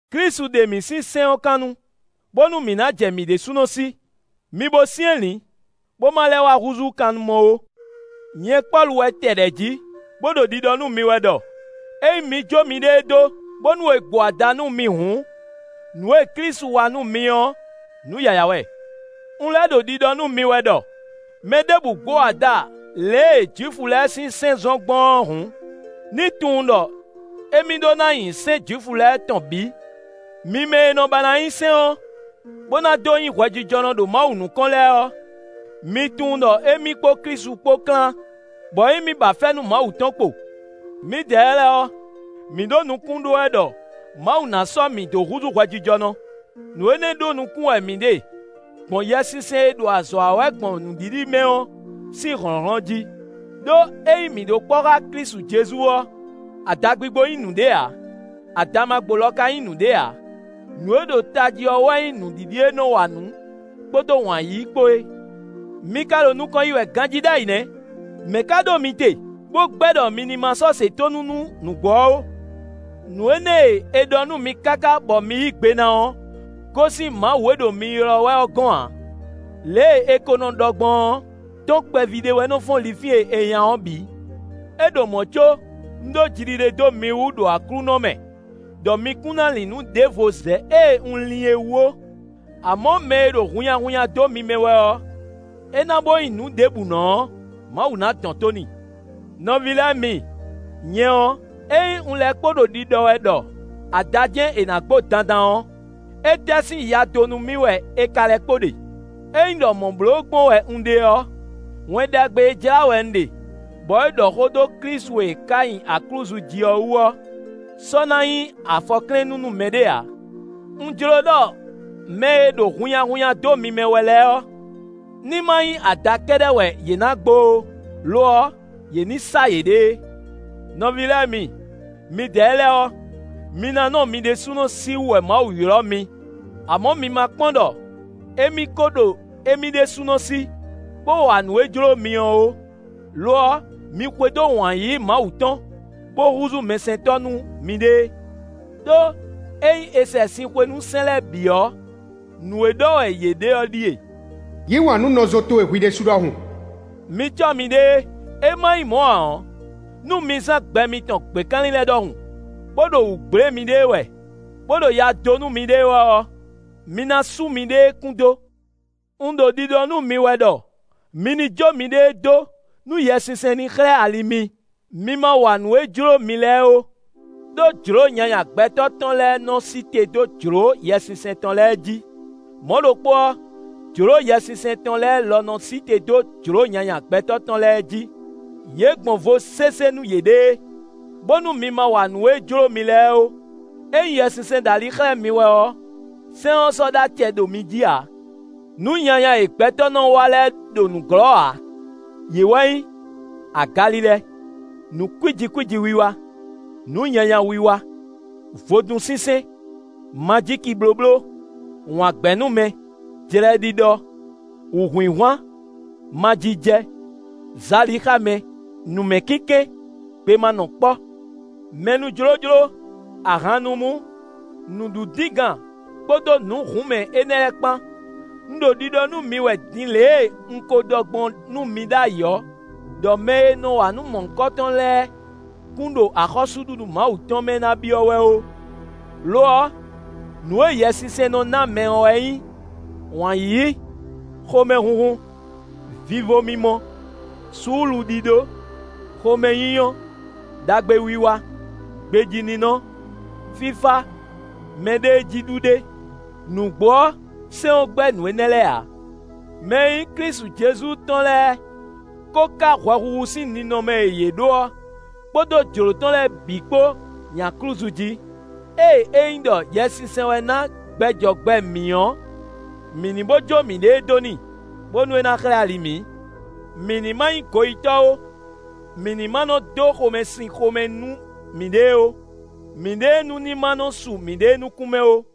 Klísu ɖe mǐ sín sɛ́n ɔ́ kannu, bónú mǐ ná jɛ mǐ ɖésúnɔ sí. Mi bo syɛ́nlǐn, bó má lɛ́ wá húzú kannumɔ ó. Nyɛ Pɔ́lu wɛ tɛ ɖɛ̌ jí, bó ɖo ɖiɖɔ nú mi wɛ ɖɔ ényí mi jó miɖée dó, bónú è gbo ada nú mi hǔn, nǔ e Klísu wa nú mi ɔ́, nǔ yǎyá wɛ. Un lɛ́ ɖo ɖiɖɔ nú mi wɛ ɖɔ: mɛ ɖěbǔ gbo ada lě e Jwifu lɛ́ɛ sín sɛ́n zɔ́n gbɔn ɔ́ hǔn, ní tunwun ɖɔ émí ɖó ná nyi sɛ́n Jwifu lɛ́ɛ tɔn bǐ. Mi mɛ e nɔ ba ná nyi sɛ́n ɔ́, bó ná dó nyí hwɛjijɔnɔ ɖo Mawu nukɔn lɛ́ɛ ɔ́, mi tunwun ɖɔ émí kpó Klísu kpó klán, bɔ émí ba fɛ́nú Mawu tɔn kpo. Mǐdɛɛ lɛ́ɛ ɔ́, mǐ ɖo nukún ɖó wɛ ɖɔ Mawu ná sɔ́ mǐ dó húzú hwɛjijɔnɔ. Nǔ énɛ́ ɖó nukún wɛ mǐ ɖe gbɔn Yɛsinsɛn e ɖo azɔ̌ wa wɛ gbɔn nǔɖiɖi mɛ ɔ́ sín hlɔ̌nhlɔ́n jí; ɖó ényí mǐ ɖo kpɔ́ xá Klísu Jezu ɔ́, adagbigbo nyí nǔɖé ǎ; adamagbo lɔ ka nyí nǔɖé ǎ. Nǔ e ɖo tají ɔ́ wɛ nyí nǔɖiɖi e nɔ wa nǔ kpódó wǎn yíyí kpó é. Mi ka ɖo nukɔn yi wɛ ganjí ɖ'ayǐ nɛ́! Mɛ̌ ka ɖó mi te bó gbɛ́ ɖɔ mi ní má sɔ́ se tónú nú nǔgbó ɔ́ ó? Nǔ énɛ́ e è ɖɔ nú mi káká bɔ mi yí gbe ná ɔ́ gosín Mawu e ɖo mi ylɔ́ wɛ ɔ́ gɔ́n ǎ. Lě e è ko nɔ ɖɔ gbɔn ɔ́: “Tɔ́n kpɛví ɖé wɛ nɔ fɔ́n linfín e è nya ɔ́ bǐ.” É ɖo mɔ̌ có un ɖó jiɖiɖe dó mi wú ɖo Aklúnɔ mɛ ɖɔ mi kún ná lin nǔ ɖěvo zɛ ée un lin é wú ó; amɔ̌ mɛ e ɖo hunnyahunnya dó mi mɛ wɛ ɔ́, é ná bo nyí nǔɖébǔnɔ ɔ́, Mawu na dɔn tó n'i. Nɔví lɛ́ɛ mi, nyɛ ɔ́, ényí un lɛ́ kpo ɖo ɖiɖɔ wɛ ɖɔ ada jɛ́n è nǎ gbo dandan ɔ́, étɛ́ sín ya dó nú mì wɛ è ka lɛ́ kpo ɖe? Ényí ɖɔ mɔ̌ bló gbɔn wɛ un ɖe ɔ́, Wɛn Ɖagbe e jlá wɛ un ɖe bɔ é ɖɔ xó dó Klísu e è ká nyi aklúzu jí ɔ́ wú ɔ́ sɔ́ ná nyí afɔklɛ́nnú nú mɛɖé ǎ. Un jló ɖɔ mɛ e ɖo hunnyahunnya dó mi mɛ wɛ lɛ́ɛ ɔ́, ní má nyí ada kɛ́ɖɛ́ wɛ yě ná gbo ó; lo ɔ́, yě ní sá yěɖée. Nɔví lɛ́ɛ mi, midɛɛ lɛ́ɛ ɔ́, mi ná nɔ mi ɖésúnɔ sí wú wɛ Mawu ylɔ́ mi; amɔ̌ mi ma kpɔ́n ɖɔ émí ko ɖo émí ɖésúnɔ sí, bó wa nǔ e jló mi ɔ́ ó. Lo ɔ́, mi xwedó wǎn yíyí Mawu tɔn, bó húzú mɛsɛntɔ́ nú miɖée. Đó ényí è sɛ sin xwe nú sɛ́n lɛ́ɛ bǐ ɔ́, nǔ e ɖɔ wɛ yě ɖe ɔ́ ɖíe: “Yǐ wǎn nú nɔzo towe hwi ɖésú ɖɔhun.” Mi cɔ́ miɖée, é má nyí mɔ̌ ǎ ɔ́, nú mi zán gbɛ mitɔn gběkanlin lɛ́ɛ ɖɔhun, bó ɖo wǔ gblé miɖée wɛ, bó ɖo ya dó nú miɖée wɛ ɔ́, mi ná sú miɖée kún dó. Un ɖo ɖiɖɔ nú mi wɛ ɖɔ mi ní jó miɖée dó nú Yɛsinsɛn ní xlɛ́ ali mi; mi ma wa nǔ e jló mi lɛ́ɛ ó. Đó jlǒ nyanya gbɛtɔ́ tɔn lɛ́ɛ nɔ sí te dó jlǒ Yɛsinsɛn tɔn lɛ́ɛ jí. Mɔ̌ ɖokpó ɔ́, jlǒ Yɛsinsɛn tɔn lɛ́ɛ lɔ nɔ sí te dó jlǒ nyanya gbɛtɔ́ tɔn lɛ́ɛ jí; yě gbɔn vo sésé nú yěɖée, bónú mi ma wa nǔ e jló mi lɛ́ɛ ó. Ényí Yɛsinsɛn ɖo ali xlɛ́ mi wɛ ɔ́, sɛ́n ɔ́ sɔ́ ɖó acɛ ɖo mi jí ǎ. Nǔ nyanya e gbɛtɔ́ nɔ wa lɛ́ɛ ɖo nǔglɔ́ ǎ; yě wɛ nyí: agalilɛ, nǔ kwíji kwíji wiwa, nǔ nyanya wiwa, vodúnsinsɛn, majíkiblóbló, wǎngbɛ́númɛ, jlɛɖiɖɔ, wǔhwinhwan, majijɛ, zalixámɛ, nǔmɛkínkɛ́n, gbemanɔkpɔ́, mɛnújlójló, ahannumú, nǔɖudíngan kpódó nǔ hǔnmɛ énɛ́ lɛ́ɛ kpán. Un ɖo ɖiɖɔ nú mi wɛ din lě e un ko ɖɔ gbɔn nú mi ɖ'ayǐ ɔ́, ɖɔ mɛ e nɔ wa nǔ mɔ̌hunkɔtɔn lɛ́ɛ kún ɖo axɔ́súɖuɖu Mawu tɔn mɛ ná byɔ́ wɛ ó. Lo ɔ́, nǔ e Yɛsinsɛn nɔ ná mɛ ɔ́ wɛ nyí wǎn yíyí, xomɛhunhun, vivo mimɔ, suúluɖíɖó, xomɛnyínyɔ́, ɖagbewiwa, gbejíninɔ, fífá, mɛɖéejíɖuɖe; nǔgbó ɔ́, sɛ́n ɔ́ gbɛ́ nǔ énɛ́ lɛ́ɛ ǎ. Mɛ e nyí Klísu Jezu tɔn lɛ́ɛ ko ká hwɛhuhu sín ninɔmɛ e yě ɖó ɔ́, kpódó jlǒ tɔn lɛ́ɛ bǐ kpó nyi aklúzu jí. Ée ényí ɖɔ Yɛsinsɛn wɛ ná gbɛ jɔ gbɛ mǐ ɔ́, mǐ ní bó jó mǐɖée dó n'i, bónú é ná xlɛ́ ali mǐ. Mǐ ní má nyí goyítɔ́ ó; mǐ ní má nɔ dó xomɛsin xomɛ nú mǐɖée ó; mǐɖée nú ní má nɔ su mǐɖée nukún mɛ ó.